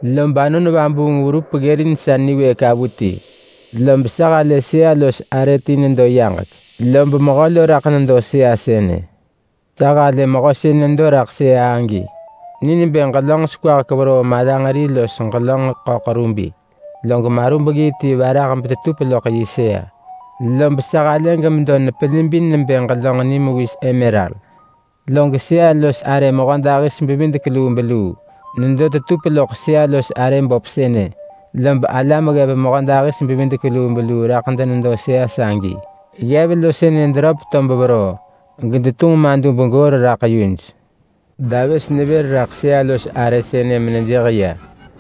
Lob Anon Vabuung verup ggërin sa niwëëk avuti, lob sa halë sëa-los-arë ti nedo yaġek, lob Mehö lo raḳ nedo sëa sënë. Sa halë Mehö sën nedo raḳ sëa agi ni nebë ġelönġ sekwahek veroo malanġeri los ġelönġ ḳöḳ rubi, log marubggii ti varah tetup loḳ yi sëa, lob sa halë gemedo nepelibin nebë ġelönġ nimewis emeral. Log sëa-los-arë mehödahis-bevidek-lubeluu nedo tetup loḳ sëa-los-arë böp sënë, lob alam ggev mehödahis-bevidek-lubeluu raḳ denedo sëa sagi. Ggev lo sënë deröp tob veroo, gedetunġ madub goor raḳ yuj. Davës nevër raḳ sëa-los-arë sënë menejëh ya,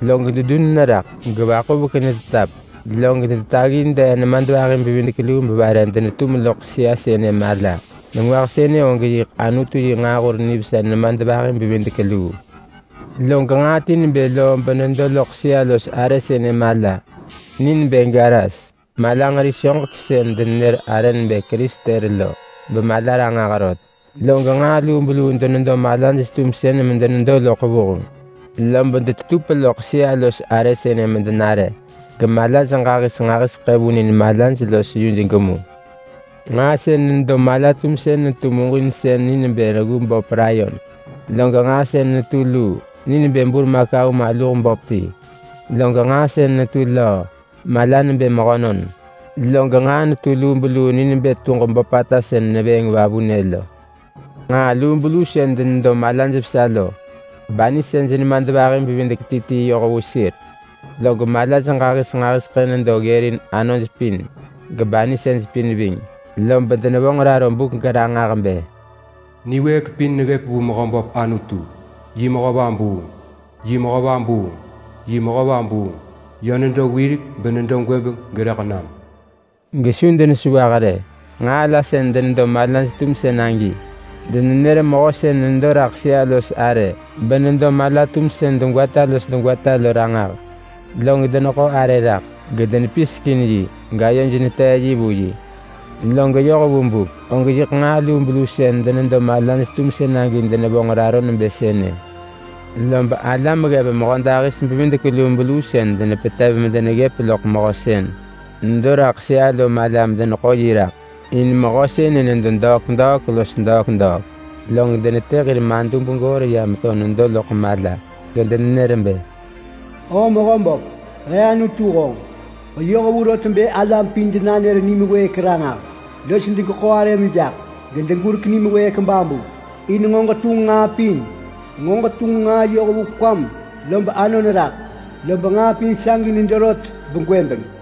log dedun neraḳ, gevaḳuvek netetap. Log detaggi dee nemadvahi-bevidek-luu mevare denetum loḳ sëa sënë mala. Nengwah sënë og yiḳ Anutu yi nġaahur nivesa nemadvahi-bevidek-luu. Log nġaa ti nebë loo benedo loḳ sëa-los-arë sënë mala. Ni nebë garas malanġeri soġek sën denenër arë nebë kristel lo bemala ranġah rot. Log nġaa lubeluu denedo malaj-tumsën medenedo loḳ vuheng, lob detetup loḳ sëa-los-arë sënë medenare, gemalaj ġahis nġahiseḳë vunin malaj los yuj gemu. Nġaa sën nedo mala-tumsën netu muġinsën ni nebë reggu böp layon. Log nġaa sën netu luu ni nebë burmakau maluh böp ti. Log nġaa sën netu löö mala nebë mehönon. Log nġaa netu lubeluu ni nebë tuġ böpata sën nevëëng vavunë lo. Nġaa lubeluu sën denedo malaj vesa lo banisej nemadvahi bevidek ti ti yoh vu sir. Log malaj ġahis nġahiseḳë nedo ggërin anoj pin gebanisej pin ving. Lob denevonġ raro buk geranġah bë: “Niwëëk pin neggëp vu Mehöböp Anutu. Yi mehö vabuung, yi mehö vabuung, yi mehö vabuung. Yö nedo wirek, benedo gwëbeng, gerëḳ nam.” Gesu denesewah rë. Nġaa la sën denedo malaj-tumsën agi, denenër Mehö sën nedo raḳ sëa-los-arë benedo mala-tumsën degwata los degwata lo ranġah. Log deneḳo arë raḳ, gedenepisek in yi, gayoj netee yi vu yi. Log yoh vu buk, og yiḳ nġaa lubeluu sën denedo malaj-tumsën agi denevonġ raro nebë sënë. Lob alam ggev mehödahis-bevidek-lubeluu sën denepetev medeneggëp loḳ Mehö sën nedo raḳ sëa lo mala medeneḳo yi raḳ. In Mehö sënë nedo degwata los degwata. Log denetë hir madub goor ya meto nedo loḳ mala, gedenenër bë: “Oo Mehöböp, he Anutu honġ. Ġeyoh vu rot bë alam pin denanër nim wëëk ranġah, los degeḳo arëm jaḳ, gedegurek nim wëëk babu. In nġo ġetunġ nġaa pin. Nġo ġetunġ nġaa yoh vu kwam, lob anon raḳ, lob nġaa pin sagi nedo rot begwëbeng.”